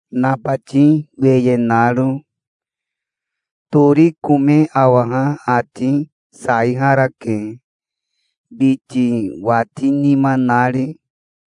nabati weye naro. Tori kome awaha ati saiharake, biti watinima nari.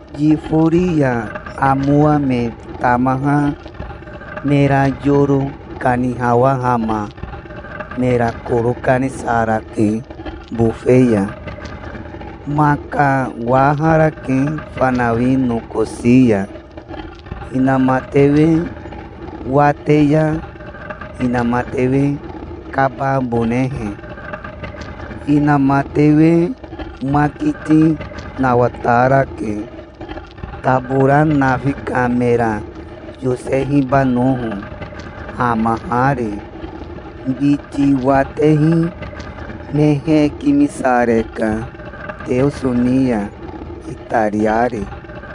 Yifori ya amowa me tamaha mera yoro kanihawahama mera koro kanisarake bofe ya. Maka waharake fanawi nokosi ya, inamatewe wate ya inamatewe kababonehe. Inamatewe makiti nawatarake, tabora nafi ka mera yosehibanoho, hamahari. Biti watehi me hekimisareka Teoso ni ya, itariari.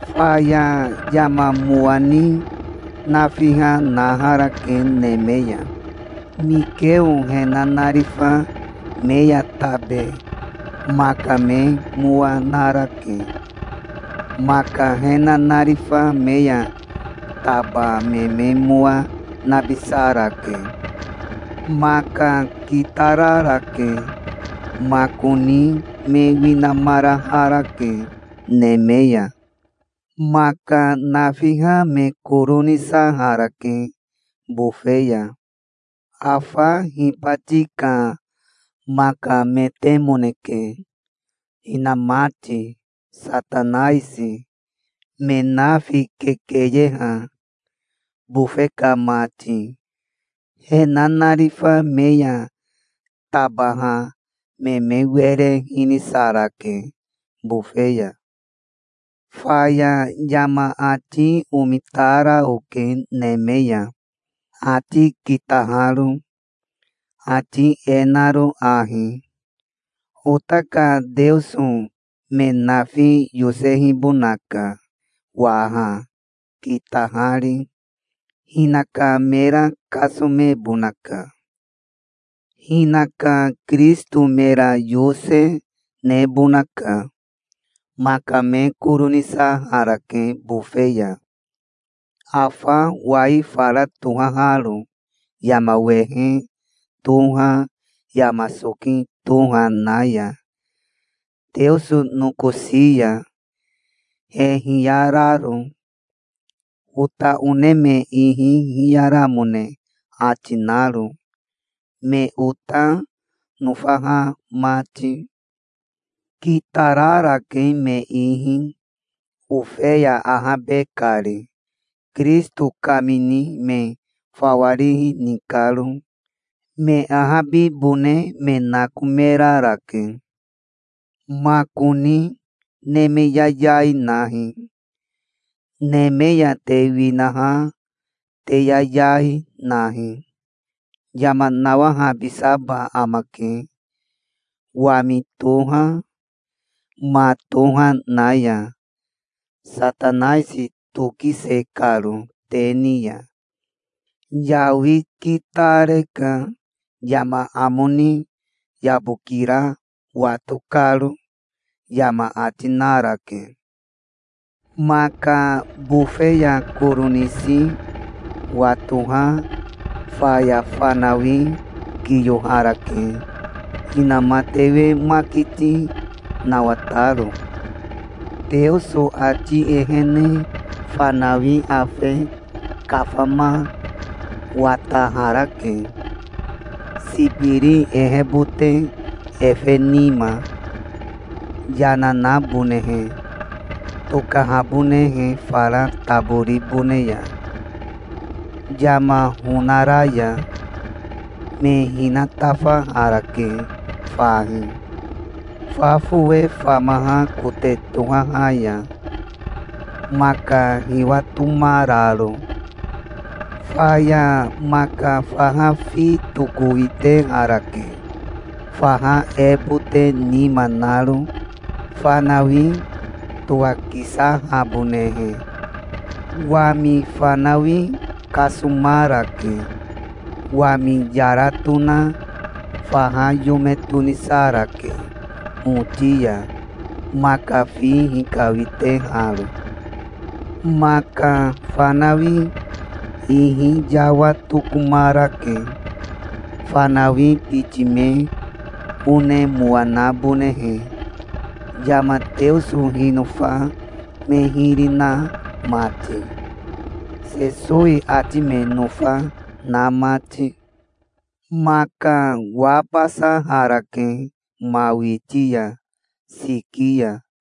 Faya yama mowa ni nafiha naharake neme ya. Mikeo he nanarifa me ya tabe maka me mowa narake. Maka he nanarifa me ya taba me me mowa nabisarake. Maka kitararake. Makoni me winamaraharake neme ya. Maka nafiha me koro nisaharake bofe ya. Afa hibati ka makametemoneke, hinamati, Satanaisi, me nafi kekeyeha, bofe ka mati. He nanarifa me ya tabaha me me were hinisarake bofe ya. Faya yama ati omitara oke neme ya, ati kitaharo, ati e naro ahi: "Ota ka Teoso me nafi yosehibonaka waha, kitahari. Hinaka mera kasomebonaka. Hinaka Kirisito mera yose nebonaka. Maka me koro nisarake bofe ya, afa wai fara tohaharo yama wehe toha yama soki toha na ya, Teoso nokosi ya, he hiyararo, ota one me ihi hiyaramone ati naro, me ota nofaha mati. Kitararake me ihi, Ofeya ahabe kari, Kirisito kamini me fawa rihi ni karo. Me ahabibone me nakomerarake. Makoni neme yayai nahi. Neme ya te winaha te yayai, nahi. Yama nawahabisaba amake wami toha ma toha na ya, Satanaisi tokise karo te ni ya. Yawi kitareka yama amo ni yabokira wato karo", yama ati narake. Maka bofe ya koro nisi watoha faya fanawi kiyoharake, inamatewe makiti nawataro. Teoso ati ehene fanawi afe kafama wataharake, sibiri ehebote efe nima, yana nabonehe tokahabonehe fara taboribone ya yama honara ya. Me hinatafaharake fahi, fa fowe famaha kote tohaha ya, maka hiwatomararo. Faya maka faha fi tokowiteharake, faha ebote nima naro, fanawi towakisahabonehe. Wami fanawi kasomarake. Wami yara tona faha yome tonisarake hoti ya, maka fi hikawiteharo. Maka fanawi ihi yawa tokomarake, fanawi biti me one mowa nabonehe, yama Teoso hinofa me hiri na mati, Sesowi ati me nofa na mati. Maka wabasaharake ma witi ya, siki ya.